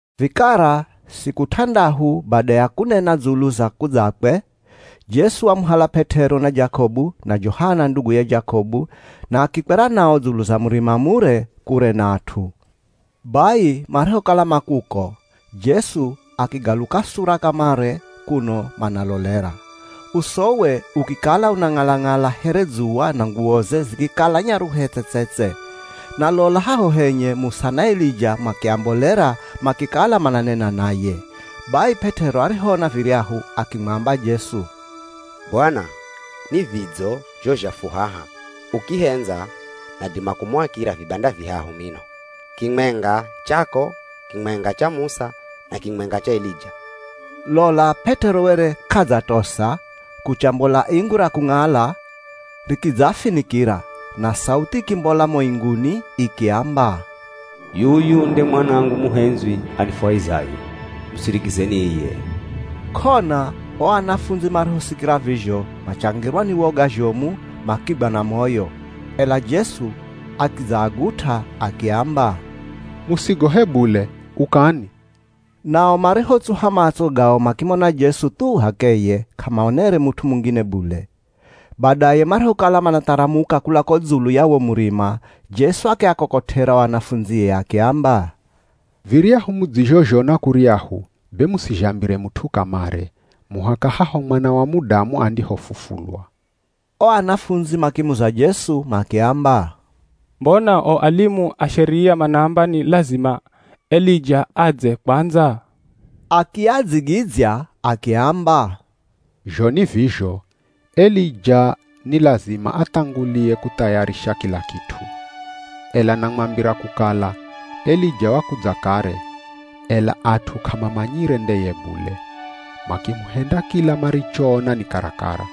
Vikara siku t'andahu bada ya kunena dzulu za kudzakwe, Jesu wamuhala P'et'ero, na Jakobu, na Johana nduguye Jakobu, na akikwera nao dzulu za murima mure, kure na at'u. Bai marihokala ma kuko, Jesu akigaluka sura kamare kuno manalolera. Usowe ukikala unang'ala-ng'ala here dzuwa na nguwoze zikikala nyaruhe tse-tse-tse. Na lola haho henye, Musa na Elija makiambolera makikala mananena naye. Bai P'et'ero arihoona viryahu akimwamba Jesu, “Bwana, ni vidzo zho zha fu haha. Ukihendza nadima kumuakira vibanda vihahu mino. Kimwenga chako, kimwenga cha Musa, na kimwenga cha Elija.” Lola P'et'ero were k'adzatosa, kuchambola ingu ra kung'ala rikidzaafinikira. Na sauthi ikimbola mo inguni ikiamba, “Yuyu nde Mwanangu muhendzwi anifwahizaye, musirikizeni iye.” K'ona o anafundzi marihosikira vizho machangirwa ni woga zhomu makigwa na moyo. Ela Jesu akidzaagut'a akiamba, “Musigohe bule, ukani.” Nao marihotsuha matso gao makimona Jesu thu h'akeye, k'amaonere mut'u mungine bule. Badaye marihokala manatharamuka kula ko dzulu ya wo murima, Jesu akiakokot'era o anafundzie akiamba, “Viryahu mudzizhozhona kuryahu, be musizhambire mut'u kamare, muhaka haho Mwana wa Mudamu andihofufulwa.” O anafundzi makimuza Jesu makiamba, “Mbona o alimu a Sheria manaamba ni lazima Elija adze kwandza?” Akiadzigidzya akiamba, “Zho ni vizho, Elija ni lazima athangulie kuthayarisha kila kit'u. Ela namwambira kukala, Elija wakudza kare, ela at'u k'amamanyire ndeye bule, makimuhenda kila marichoona ni karakara.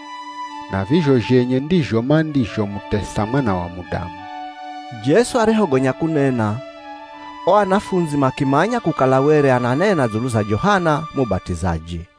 Na vizho zhenye ndizho mandizhomutesa Mwana wa Mudamu.” Jesu arihogonya kunena, o anafundzi makimanya kukala were ananena dzulu za Johana Mubat'izaji.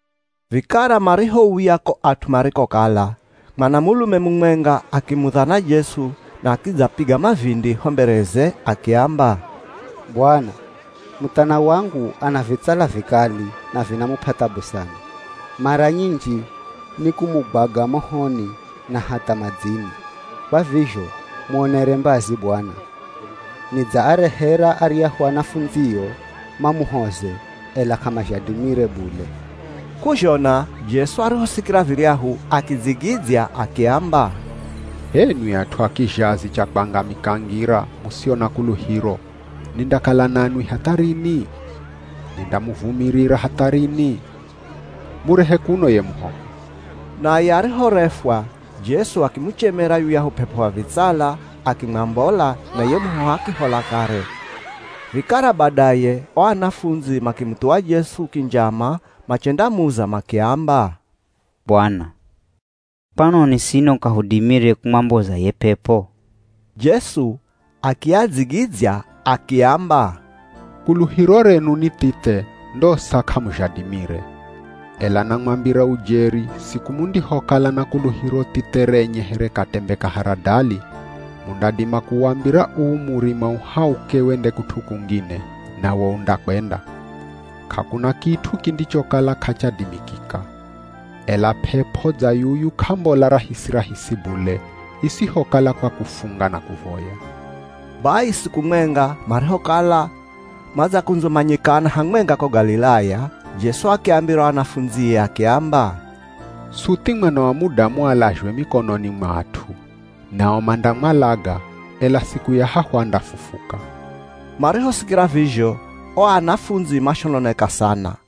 Vikara marihouya ko at'u marikokala, mwanamulume mumwenga akimudhana Jesu na akidzapiga mavindi ho mbereze akiamba, “Bwana, muthana wangu ana vitsala vikali na vinamup'a thabu sana. Mara nyinji nikumugwaga mohoni na hatha madzini. Kwa vizho muonere mbazi Bwana. Nidzaarehera aryahu anafundzio mamuhoze ela k'amazhadimire bule.” K'uzhona Jesu arihosikira viryahu akidzigidzya akiamba, “H'enwi at'u a kizhazi cha kwangamika ngira, musio na kuluhiro, nindakala nanwi hatha rini? Nindamuvumirira hatha rini? Murehe kuno ye muhoho.” Naye arihorefwa, Jesu akimuchemera yuyahu p'ep'o wa vitsala akimwambola, na ye muhoho akihola kare. Vikara badaye, o anafundzi makimuthuwa Jesu kinjama machendamuza makiamba, “Bwana, kwanoni sino k'ahudimire kumwamboza ye p'ep'o?” Jesu akiadzigidzya akiamba, “Kuluhiro renu ni thithe ndosa k'amuzhadimire. Ela namwambira ujeri siku mundihokala na kuluhiro thithe renye here katembe ka haradali, mundadima kuwambira uu murima uhauke wende kut'u kungine, nawo undakwenda. K'akuna kit'u kindichokala k'achadimikika. [ Ela p'ep'o dza yuyu k'ambola rahisi-rahisi bule, isihokala kwa kufunga na kuvoya.”] Bai siku mwenga, marihokala madzakundzumanyikana hamwenga ko Galilaya, Jesu akiambira o anafundzie akiamba, “Suthi Mwana wa Mudamu alazhwe mikononi mwa at'u. Nao mandamwalaga, ela siku ya hahu andafufuka.” Marihosikira vizho, o anafundzi mashononeka sana.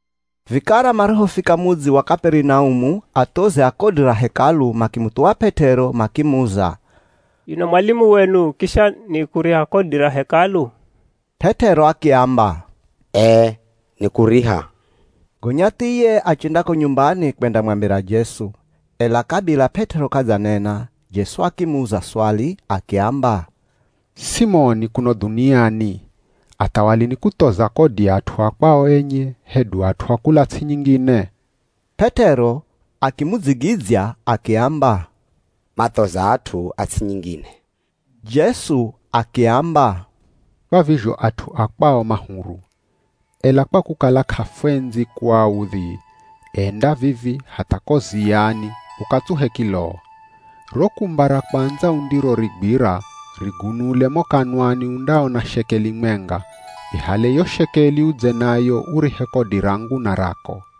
Vikara marihofika mudzi wa Kaperinaumu, athozi a kodi ra Hekalu makimuthuwa P'et'ero makimuza, “Yuno mwalimu wenu kisha nikuriha kodi ra Hekalu?” P'et'ero akiamba, “Ee nikuriha.” Gonya thiye achenda ko nyumbani kwendamwambira Jesu. Ela kabila P'et'ero k'adzanena, Jesu akimuza swali akiamba, “Simoni kuno dhuniani, athawali nikuthoza kodi at'u a kwao enye, hedu at'u a kula ts'i nyingine?” P'et'ero akimudzigidzya akiamba, “Mathoza at'u a ts'i nyingine.” Jesu akiamba, “Kwa vizho at'u a kwao ma huru. Ela kwa kukala k'afwendzi kuaudhi, enda vivi hatha ko ziyani ukatsuhe kiloo. Ro kumba ra kwandza undirorigwira rigunule mo kanwani undaona shekeli mwenga, ihale yo shekeli udze nayo urihe kodi rangu na rako.”